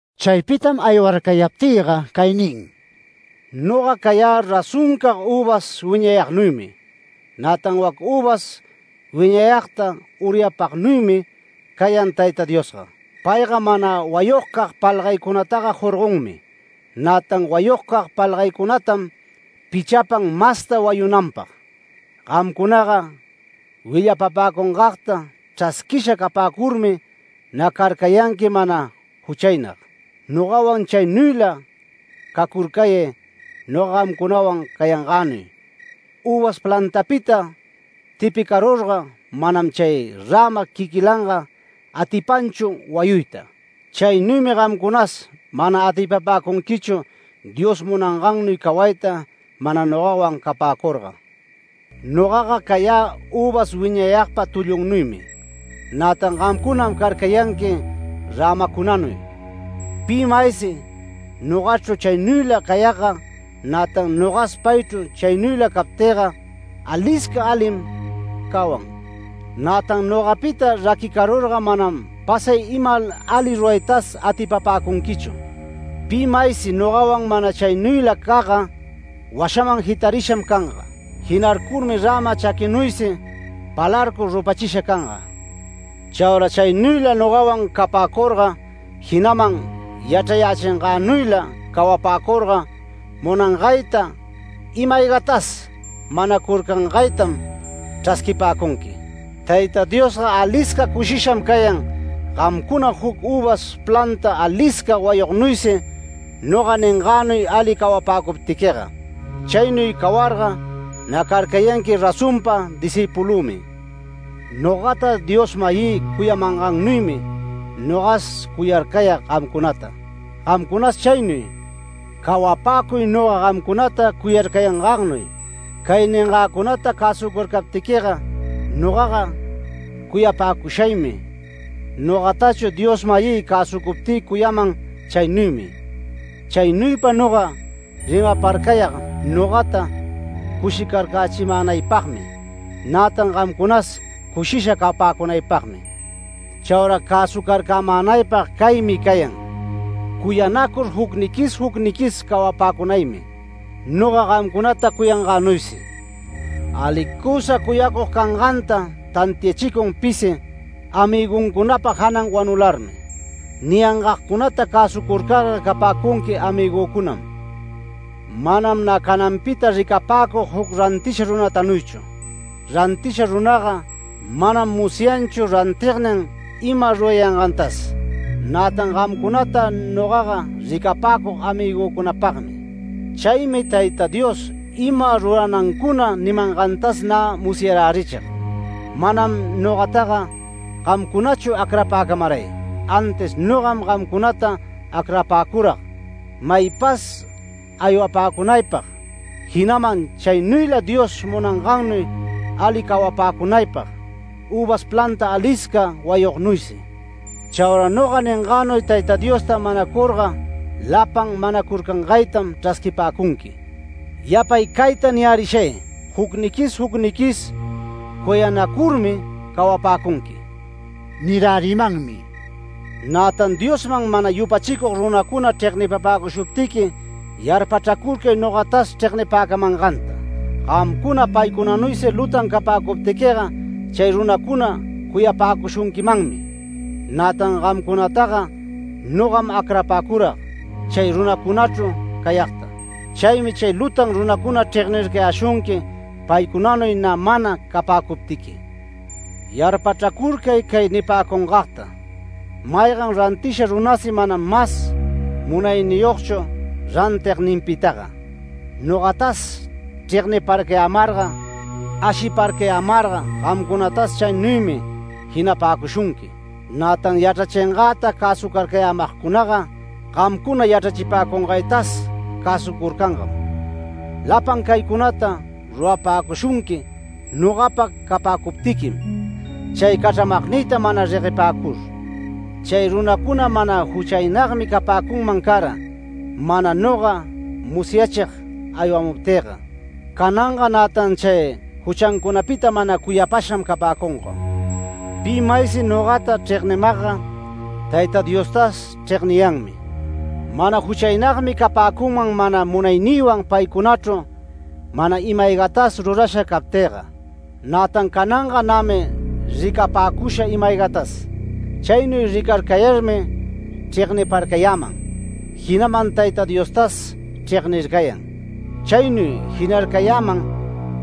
Chaypitam aywarcayaptïga cay nin: “Noga cayä razonpacag üvas wiñayagnuymi. Nätan wac üvas wiñayagta uryapagnuymi cayan Tayta Diosga. Payga mana wayugcag palgaycunataga jorgonmi, nätan wayugcag palgaynincunatam pichapan masta wayunanpag. Gamcunaga willapäcungagta chrasquisha capäcurmi nä carcayanqui mana juchaynag. Nogawan chaynuyla cacurcayay, noga gamcunawan cayangänuy. Üvas plantapita tipicarurga manam chay räma quiquilanga atipanchu wayuyta. Chaynuymi gamcunas mana atipapäcunquichu Dios munangannuy cawayta, mana nogawan capäcurga. Nogaga cayä üvas wiñayagpa tullunnuymi, nätan gamcunam carcayanqui rämacunanuy. Pi maysi nogachru chaynuyla cayagga, nätan nogas paychru chaynuyla captïga, alisca alim cawan. Nätan nogapita raquirurga manam pasay ima ali ruraytas atipapäcunquichu. Pi maysi nogawan mana chaynuylacagga, washaman jitarisham canga. Jinarcurmi räma chaquinuysi, palarcur rupachisha canga. Chaura chaynuyla nogawan capäcurga, jinaman yachrachingänuyla cawapäcurga, munangayta ima-aygatas manacurcangaytam chrasquipäcunqui. Tayta Diosga alisca cushisham cayan gamcuna juc üvas planta alisca wayugnuysi noga ningänuy ali cawapäcuptiquiga. Chaynuy cawarga nä carcayanqui razonpa discïpulümi. Nogata Dios-mayï cuyamangannuymi nogas cuyarcayag gamcunata. Gamcunas chaynuy cawapäcuy, noga gamcunata cuyarcayangagnuy. Cay ningäcunata cäsucurcaptiquiga nogaga cuyapäcushaymi. Nogatachu Dios-mayï cäsucuptï cuyayäman chaynuymi. Chaynuypa noga rimaparcayag nogata cushicarcächimänaypagmi, nätan gamcunas cushisha capäcunaypagmi. Chaura cäsucarcämänaypag caymi cayan: Cuyanacur jucniquis jucniquis cawapäcunaymi, noga gamcunata cuyangänuysi. Alicusa cuyacug canganta tantiachicun pisi, amïguncunapa janan wanularmi. Niyangagcunata cäsucurcarga capäcunqui amïgücunam. Manam nä cananpita ricapäcug juc rantisha runatanuychu. Rantisha runaga manam musyanchu rantignin ima rurayangantas, nätan gamcunata nogaga ricapäcug amïgücunapagmi. Chaymi Tayta Dios ima ruranancuna nimangantas nä musyarärichig. Manam nogataga gamcunachu acrapäcamaray, antis nogam gamcunata acrapäcurag maypas aywapäcunaypag. Jinaman chaynuyla Dios munangannuy ali cawapäcunaypag üvas planta alisca wayugnuysi. Chaura noga ningänuy Tayta Diosta manacurga lapan manacurcangaytam chrasquipäcunqui. Yapay cayta niyärishay: Jucniquis jucniquis cuyanacurmi cawapäcunqui” nirärimanmi. “Nätan Diosman mana yupachicug runacuna chregnipäcushuptiqui yarpachracurcay nogatas chregnipäcamanganta. Gamcuna paycunanuysi lutan capäcuptiquiga chay runacuna cuyapäcushunquimanmi. Nätan gamcunataga nogam acrapäcurag chay runacunachru cayagta. Chaymi chay lutan runacuna chregnircayäshunqui paycunanuy nä mana capäcuptiqui. Yarpachracurcay cay nipäcungagta: Maygan rantisha runasi manam mas munayniyogchu rantigninpitaga. Nogatas chregniparcayämarga, ashiparcayämarga, gamcunatas chaynuymi jinapäcushunqui. Nätan yachrachingäta cäsucarcayämagcunaga gamcuna yachrachipäcungaytas cäsucurcangam. Lapan caycunata rurapäcushunqui nogapa capäcuptiquim chay cachramagnïta mana reguepäcur. Chay runacuna mana juchaynagmi capäcunman cara, mana noga musyachig aywamuptïga. Cananga nätan chay juchancunapita mana cuyapasham capäcunga. Pi maysi nogata chregnimagga, Tayta Diostas chregniyanmi. Mana juchaynagmi capäcunman mana munaynïwan paycunachru mana ima-aygatas rurasha captïga. Nätan cananga nämi ricapäcusha ima-aygatas. Chaynuy ricarcayarmi chregnircayäman, jinaman Tayta Diostas chregnircayan. Chaynuy jinarcayäman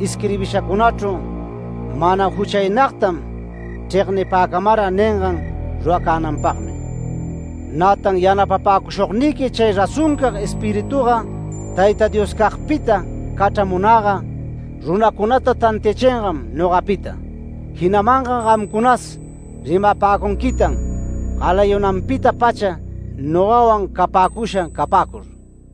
isquirbishacunachru: ‘Mana juchaynagtam chregnipäcamara’ ningan ruracänanpagmi. Nätan yanapapäcushugniqui chay razoncag Espirituga Tayta Dioscagpita cachramunäga runacunata tantiachingam nogapita. Jinamanga gamcunas rimapäcunquitan galayunanpita-pacha nogawan capäcusha capäcur”.